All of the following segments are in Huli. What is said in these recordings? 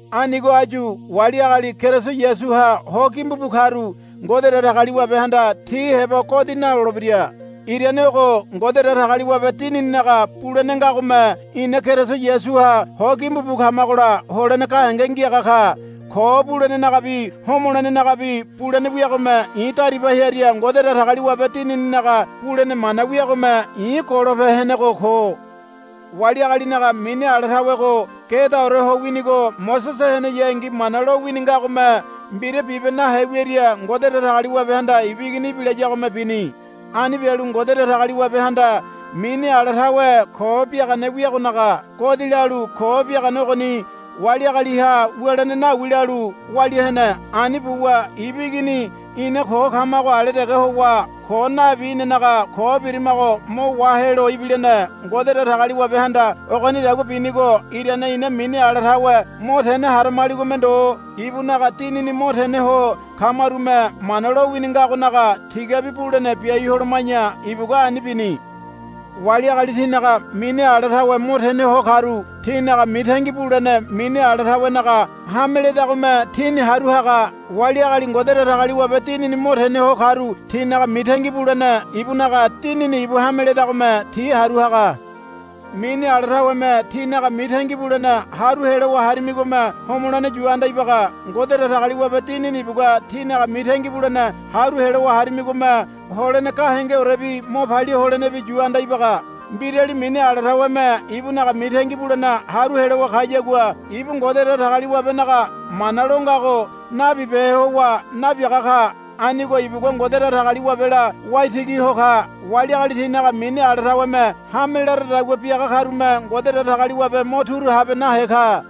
Anigo áyu wali agali Keriso Yasuha ho gimbu bu karu Ngode Datagaliwabehanda ti heba godi nalolebira. Irane ogo Ngode Datagaliwabe Dinininaga bulene ngagome ina Keriso Yasuha ho gimbu bu kamagola holene gahenge ngiaga ka. Ko bulenenagabi homolenenagabi bulene wiagome i̱ dariba hearia Ngode Datagaliwabe Dinininaga bulene mana wiagome i̱ golope henego ko. Wali agalinaga mini ala tawego gedaore ho winigo Mosese heneyangi Mana lowini ngagome mbira bibe nahe wiaria Ngode Datagaliwabehanda ibu Igini ibilayagome bini. Ani bialu Ngode Datagaliwabehanda mini ala tawe ko biagane wiagonaga godi lalu ko biagane ogoni wali agaliha wulene nawi lalu walia hene. Ani buwa ibu Igini ina ko kamago ale dege howa ko nabi inanaga ko birimago mo wahelo ibilene. Ngode Datagaliwabehanda ogonidagua binigo irane ina mini ala tawe mo tene haramaligome ndo ibunaga Dinini mo tene ho kamarume Mana lowini ngagonaga tigabi bulene biai holoma̱ya ibugua ani bini. Wali agali tinaga mini ala tawe mo tene ho karu tinaga mitangi bulene mini ala tawenaga hame ledagome tini haru haga. Wali agali Ngode Datagaliwabe Dinini mo tene ho karu tinaga mitangi bulene ibunaga Dinini ibu hame ledagome ti haru haga. Mini ala taweme tínaga mitangi bulene haru helowa harimigome homolene yu anda ibaga. Ngode Datagaliwabe Dinini ibugua tínaga mitangi bulene haru helowa harimigome holene gahengeorebi mo palia holenebi yu anda ibaga. Mbirali mini ala taweme ibunaga mitangi bulene haru helowa kayagua ibu Ngode Datagaliwabenaga mana lo ngago nabibehe howa nabiaga ka. Anigo ibugua Ngode Datagaliwabela waitigi ho ka. Wali agali tinaga mini ala taweme hame laradagua biaga karume Ngode Datagaliwabe mo turu habe nahe ka.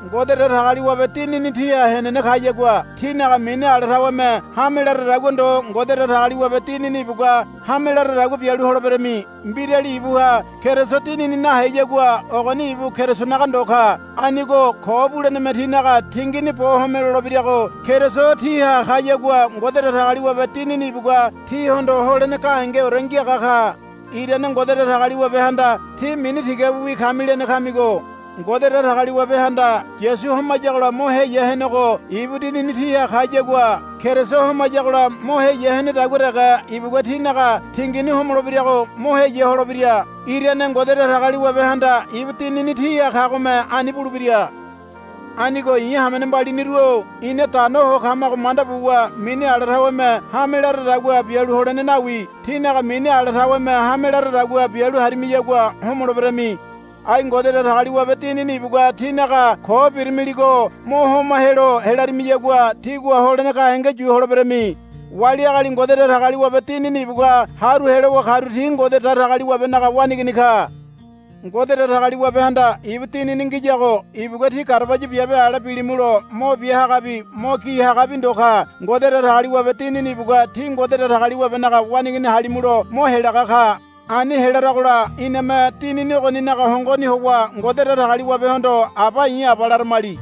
Ngode Datagaliwabe Dinini tíha henene kayagua tínaga mini ala taweme hame laradagua ndo Ngode Datagaliwabe Dinini ibugua hame laradagua bialu holeberami. Mbirali ibuha Keriso Dinini naheyagua ogoni ibu Kerisonaga ndo ka. Anigo ko buleneme tínaga tingini bo homolebirago Keriso tíha kayagua Ngode Datagaliwabe Dinini ibugua tíhondo holene gahengeore ngiaga ka. Irane Ngode Datagaliwabehanda, Tí mini tigabiwi kami, lene kamigo. Ngode Datagaliwabehanda Yasu homayagola mo heya henego ibu Dinini tíha kayagua Keriso homayagola mo heya henedagua dege ibugua tínaga tingini homolebirago mo heya holebira. Irane Ngode Datagaliwabehanda ibu Dinini tíha kagome ani bulebira. Anigo i̱ hamene mbaliniru-o ina dano ho kamago manda buwa mini ala taweme hame laradagua bialu holene nawi. tínaga mini ala taweme hame laradagua bialu harimiyagua homoleberami. Ai Ngode Datagaliwabe Dinini ibugua tínaga ko beramiligo mo homa helo helarimiyagua tígua holene gahenge yu holeberami. Wali agali Ngode Datagaliwabe Dinini ibugua haru helowa karu ti Ngode Datagaliwabenaga waneigini ka. Ngode Datagaliwabehanda ibu Dinini ngiyago ibugua tí garabaya biabe ale bilimulo mo bia hagabi mo gi hagabi ndo ka. Ngode Datagaliwabe Dinini ibugua tí Ngode Datagaliwabenaga waneigini halimulo mo helaga ka. Ani helaragola iname Dinini ogoninaga hongoni howa Ngode Datagaliwabehondo, Aba i̱ Aba, laramili.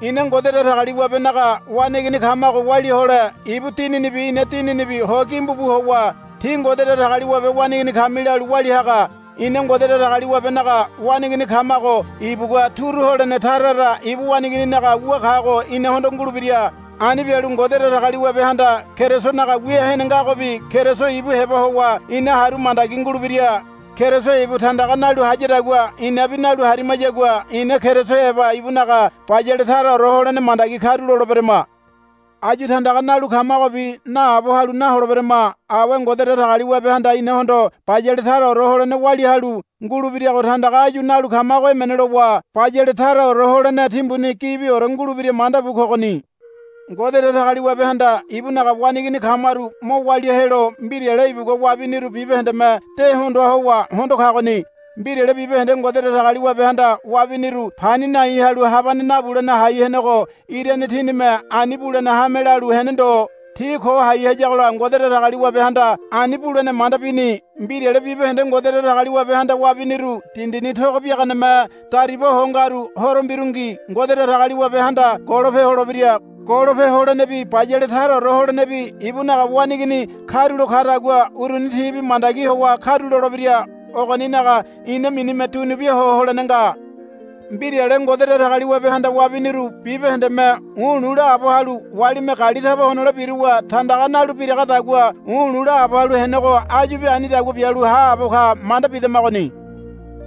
Ina Ngode Datagaliwabenaga waneigini kamago walia hole ibu Dininibi ina dininibi ho gimbu bu howa, Tí Ngode Datagaliwabe waneigini kami, lalu walia haga. Ina Ngode Datagaliwabenaga waneigini kamago ibugua turu holene tara tara ibu waneigininaga wu kago inahondo ngulebira. Ani bialu Ngode Datagaliwabehanda Kerisonaga wia hene ngagobi Keriso ibu heba howa ina haru mandagi ngulebira. Keriso ibu tandaga nalu hayadagua inabi nalu harimayagua ina Keriso heba ibunaga bayale taraore holene mandagi karuloleberama. Áyu tandaga nalu kamagobi naabo halu naholeberama. Awe Ngode Datagaliwabehanda inahondo bayale taraore holene walia halu ngulebirago tandaga áyu nalu kamago emene lowa bayale taraore holene timbuni gibiore ngulebira manda bu kogoni. Ngode Datagaliwabehanda ibunaga waneigini kamaru mo walia helo mbirale ibugua wabiniru bibahendeme de hondoa howa hondo kagoni. Mbirale bibahende Ngode Datagaliwabehanda wabiniru pani nai halu habane nabulene hai henego irane tinime ani bulene hame lalu hene ndo. Ti ko hai hayagola Ngode Datagaliwabehanda ani bulene manda bini. Mbirale bibahende Ngode Datagaliwabehanda wabiniru dindini togo biaganeme dariba ho ngaru horo mbirungi Ngode Datagaliwabehanda golope holebira. Golope holenebi bayale taraore holenebi ibunaga waneigini karulo kadagua uruni tibi mandagi howa karulolebira. Ogoninaga ina minime dunubia ho holene nga. Mbirale Ngode Datagaliwabehanda wabiniru bibahendeme u̱lu̱ laabo halu walime gali taba honole biruwa tandaga nalu biragadagua u̱lu̱ laabo halu henego áyubi anidagua bialu haabo ka manda bidamagoni.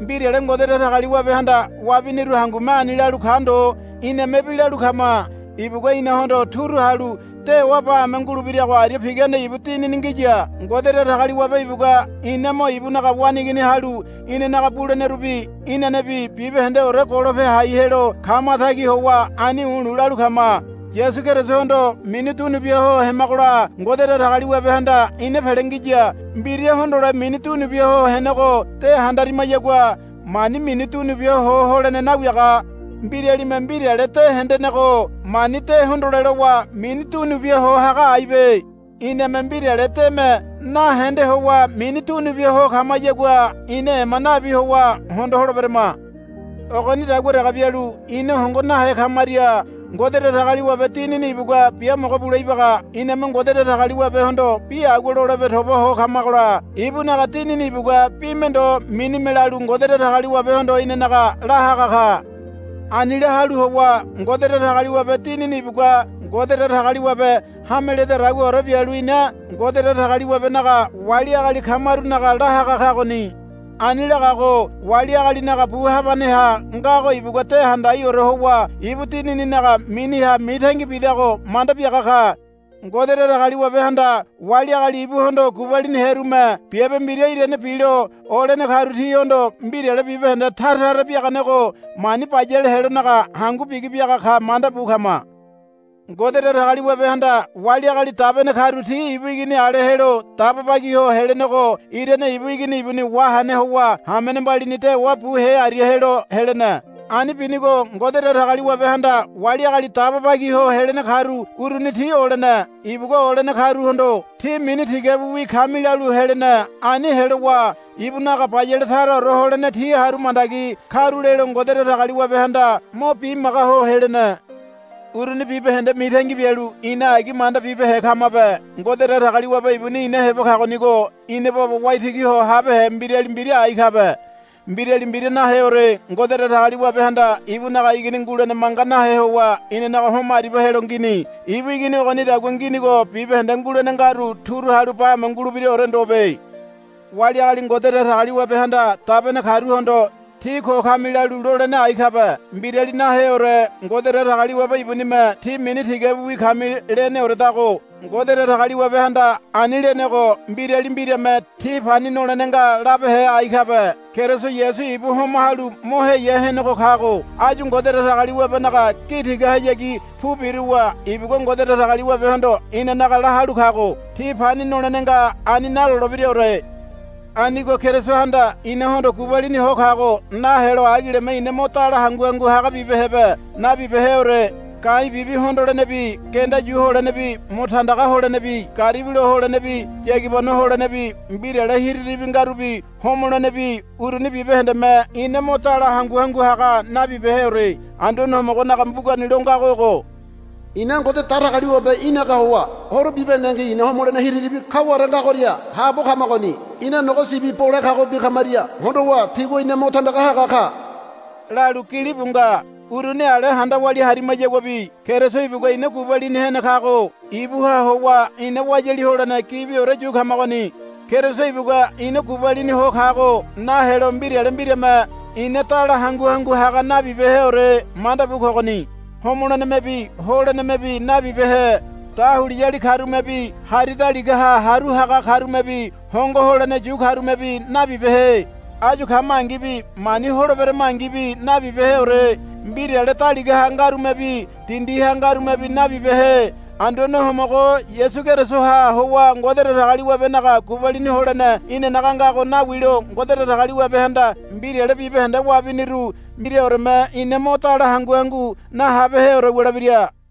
Mbirale Ngode Datagaliwabehanda wabiniru hangume ani lalu ka ndo inamebi lalu kama. Ibugua inahondo turu halu dewa bame ngulebirago aria pigane ibu Dinini ngiya. Ngode Datagaliwabe ibugua ina mo ibunaga waneigini halu inanaga bulenerubi inanebi bibahendeore golope hai helo kamatagi howa ani u̱lu̱ lalu kama. Yasu Kerisohondo mini dunubia ho hemagola Ngode Datagaliwabehanda ina pele ngiya. Mbira hondole mini dunubia ho henego de handarimayagua mani mini dunubia ho holene nawiaga. Mbiralime mbirale de hendenego mani de hondole lowa mini dunubia ho haga aibe. Iname mbirale deme nahende howa mini dunubia ho kamayagua ina ema nabi howa hondo holeberama. Ogonidagua dege bialu ina hongo nahe kamaria Ngode Datagaliwabe Dinini ibugua biamogo bule ibaga. Iname Ngode Datagaliwabehondo bi agua lolebe toba ho kamagola ibunaga Dinini ibugua bime ndo minime lalu Ngode Datagaliwabehondo inanaga la haga ka. Ani la halu howa Ngode Datagaliwabe Dinini ibugua Ngode Datagaliwabe hame ledadaguaore bialu ina Ngode Datagaliwabenaga wali agali kamarunaga la haga kagoni. Ani lagago wali agalinaga bu habaneha ngago ibugua de handagaore howa ibu Dinininaga miniha mitangi bidago manda biaga ka. Ngode Datagaliwabehanda wali agali ibuhondo gubaliniherume biabe mbira irane bilo olene karu tihondo mbirale bibahende tara tara biaganego mani bayale helonaga hangu bigi biaga ka manda bu kama. Ngode Datagaliwabehanda wali agali dabene karu ti ibu Igini ale helo daba bagi ho helenego irane ibu Igini ibuni wahene howa hamene mbalini dewa buhe aria helo helene. Ani binigo Ngode Datagaliwabehanda wali agali daba bagi ho helene karu uruni ti olene. Ibugua olene karuhondo, Tí mini tigabiwi kami, lalu helene. Ani helowa ibunaga bayale taraore holene ti haru mandagi karulelo Ngode Datagaliwabehanda mo bimaga ho helene. Uruni bibahende mitangi bialu ina agi manda bibehe kamabe. Ngode Datagaliwabe ibuni ina heba kagonigo ina baba waitigi ho habehe mbirali mbira ai kabe. Mbirali mbira naheore. Ngode Datagaliwabehanda ibunaga Igini ngulene manga nahe howa inanaga homo aribia helo ngini. Ibu Igini ogonidagua nginigo bibahende ngulene ngaru turu halu bame ngulebiraore ndobe. Wali agali Ngode Datagaliwabehanda dabene karuhondo, Tí ko kami, lalu lolene ai kabe. Mbirali naheore. Ngode Datagaliwabe ibunime, Tí mini tigabiwi kami, leneoredago. Ngode Datagaliwabehanda ani lenego mbirali mbirame, Tí pani nolene nga, labehe ai kabe. Keriso Yasu ibu homa halu mo heya henego kago áyu Ngode Datagaliwabenaga gi tigahayagi pu biruwa ibugua Ngode Datagaliwabehondo inanaga la halu kago. Tí pani nolene nga, ani nalolebiraore. Anigo Kerisohanda inahondo gubalini ho kago nahelo agileme ina mo dala hangu hangu haga bibehebe. Nabibeheore. Ga̱i̱ bibi hondolenebi genda yu holenebi mo tandaga holenebi garibilo holenebi yagibano holenebi mbirale hiriribi ngarubi homolenebi uruni bibahendeme ina mo dala hangu hangu haga nabibeheore. Anduane Homogonaga mbugani lo ngago ogo, Ina Ngode Datagaliwabe í̠naga howa horo bibahendengi ina homolene hiriribi kaware ngagoria haabo kamagoni. Ina nogo sibi bole kagobi kamaria hondowa tigua ina mo tandaga haga ka, lalu gilibu nga. Uruni ale handa walia harimayaguabi Keriso ibugua ina gubalini hene kago ibuha howa ina wayali holene gibiore yu kamagoni. Keriso ibugua ina gubalini ho kago nahelo mbirale mbirame ina dala hangu hangu haga nabibeheore manda bu kogoni. Homolenemebi holenemebi nabibehe. Dahuliyali karumebi hari daligaha haru haga karumebi hongo holene yu karumebi nabibehe. Áyu kamangibi mani holeberamangibi nabibeheore. Mbirale daligaha ngarumebi dindiha ngarumebi nabibehe. Anduane Homogo Yasu Kerisoha howa Ngode Datagaliwabenaga gubalini holene inanaga ngago nawilo Ngode Datagaliwabehanda mbirale bibahende wabiniru mbiraoreme ina mo dala hangu hangu nahabeheore wulebira.